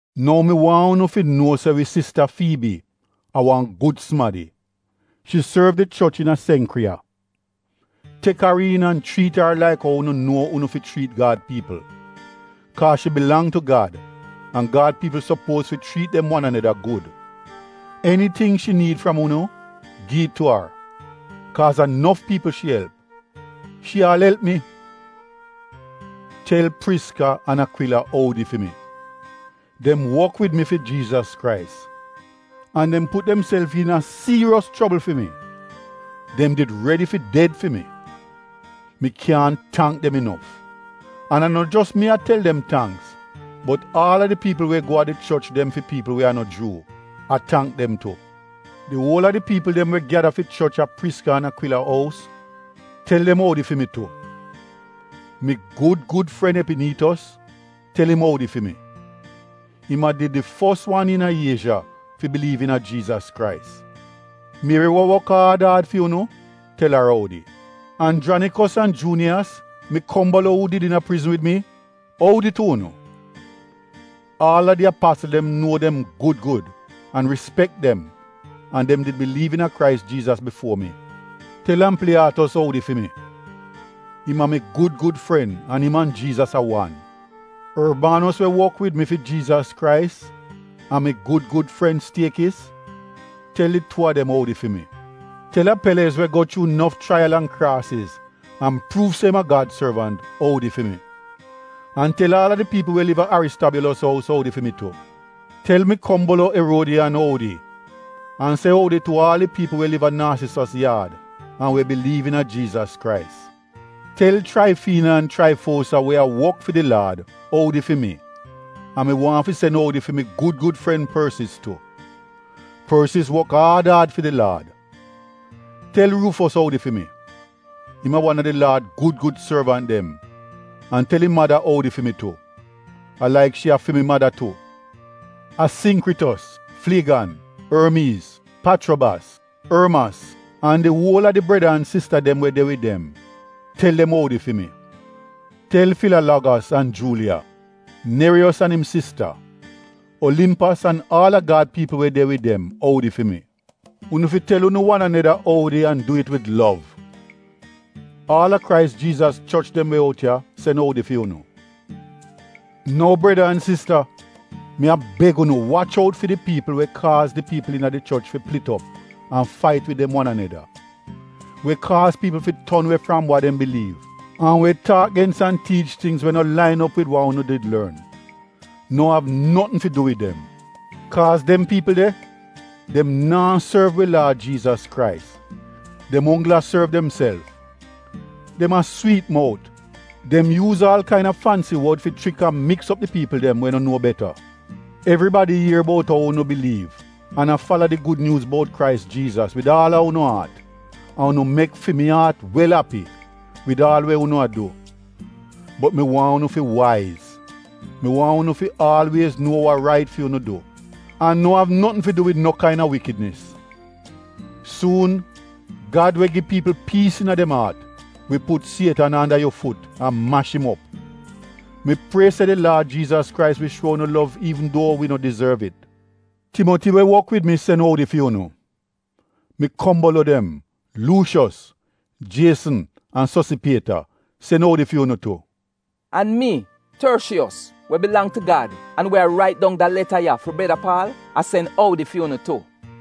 Nou mi waahn unu fi nuo se wi sista Fiibi a wan gud sumadi — shi sorv di choch iina Senkriya. Tek ar iin an chriit ar laik ou unu nuo unu fi chriit Gad piipl, kaaz shi bilang tu Gad, an Gad piipl sopuoz fi chriit dem wan aneda gud. Eniting shi niid fram unu, gi it tu ar, kaaz a nof piipl shi elp — shi aal elp mi. Tel Priska an Akwila oudi fi mi. Dem wok wid mi fi Jiizas Krais an dem put demself iina dienja fi mi — dem did redi fi ded fi mi. Mi kyaahn tangk dem inof, an a no jos mi a tel dem tangks bot aal a di piipl we go a di choch dem fi piipl we a no Juu, a tangk dem tu. Di uol a di piipl dem we gyada fi choch a Priska an Akwila ous, tel dem oudi fi mi tu. Mi gud gud fren Epiniitos tel im oudi fi mi. Im a did di fos wan iina Iezha fi biliiv iina Jiizas Krais. Mieri we wok aad aad fi unu, tel ar oudi. Anjranikos an Juuniyas, mi kombolo uu did iina prizn wid mi, oudi tu unu. Aal a di apasl dem nuo dem gud gud an rispek dem an dem did biliiv iina Krais Jiizas bifuo mi. Tel Ampliyaatos oudi fi mi. Im a mi gud gud fren an im an Jiizas a wan. Orbanos we wok wid wi fi Jiizas Krais an mi gud gud fren Stiekis, tel di tuu a dem oudi fi mi. Tel Apelez we go chuu nof chraiyalz an kraasiz an pruuv se im a Gad sorvant oudi fi mi. An tel aal a di piipl we liv a Aristobyuulos oudi fi mi tu. Tel mi kombolo Eruodiyan oudi an se oudi tu aal di piipl we liv a Narsisos yaad an we biliiv iina Jiizas Krais. Tel Chraifiina an Chraifuosa we a wok fi di Laad oudi fi mi an mi waahn fi sen oudi fi mi gud gud fren Porsis tu. Porsis wok aad aad fi di Laad. Tel Ruufos oudi fi mi. Im a wan a di Laad gud gud sorvant dem an tel im mada oudi fi mi tu — a laik shi a fi mi mada tu. Asingkritos, Flegan, Ormiiz, Pachrobas, Ormas an di uol a di breda an sista dem we de wid dem, tel dem oudi fi mi. Tel Filalogos an Juuliya, Neriyos an im sista, Olimpas an aal a Gad piipl we de de wid dem oudi fi mi. Unu fi tel unu wan aneda oudi an du it wid lov. Aal a Krais Jiizas choch dem we out ya sen oudi fi unu. Nou breda an sista, mi a beg unu wach out fi di piipl we kaaz di piipl iina di choch fi plit op an fait wid dem wan aneda, we kaaz piipl fi ton we fram wa dem biliiv an we taak gens an tiich tingz we no lain op wid wa unu did lorn. No av notn fi du wid dem! Kaaz dem piipl de, dem naa sorv wi Laad Jiizas Krais, dem onggl a sorv demself. Dem a swiit-mout, dem yuuz aal kaina fansi wod fi chrik an miks op di piipl dem we no nuo beta. Evribadi ier bout ou unu biliiv an a fala di Gud Nyuuz bout Krais Jiizas wid aal a unu aat an unu mek fi mi aat wel api wid aal we unu a du. Bot mi waahn unu fi waiz — mi waahn unu fi aalwiez nuo wa rait fi unu du an no av notn fi du wid no kaina wikidnis. Suun, Gad we gi piipl piis iina dem aat, wi put Sietan anda yu fut an mash im op. Mi prie se di Laad Jiizas Krais wi shuo unu lov iivn duo wi no dizorv it. Timoti, we wok wid mi sen oudi fi unu. Mi kombolo dem: Luushos, Jiesn an Sosipieta sen oudi fi unu tu. An mi, Torshiiyos we bilang tu Gad an we a rait dong da leta ya fi breda Paal, a sen oudi fi unu tu.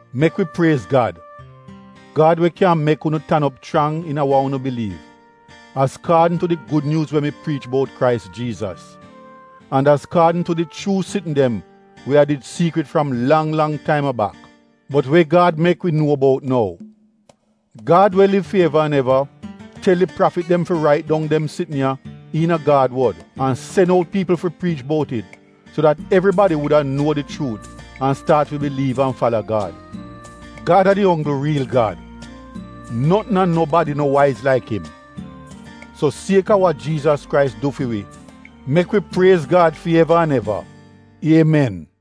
Mek wi priez Gad — Gad we kyan mek unu tan op chrang iina unu iina wa unu biliiv azkaadn tu di Gud Nyuuz we mi priich bout Krais Jiizas, an azkaadn tu di chuu sitn dem we a did siikrit fram lang lang taim a bak, bot we Gad mek wi nuo bout nou. Gad we liv fi eva an eva, tel di prafit dem fi rait dong dem sitn ya iina Gad wod, an sen out piipl fi priich bout it so dat evribadi wuda nuo di chuut an staat fi biliiv an fala Gad. Gad a di onggl riil Gad, notn an nobadi no waiz laik im. So sieka wa Jiizas Krais du fi wi, mek wi priez Gad fi eva an eva. Iemen!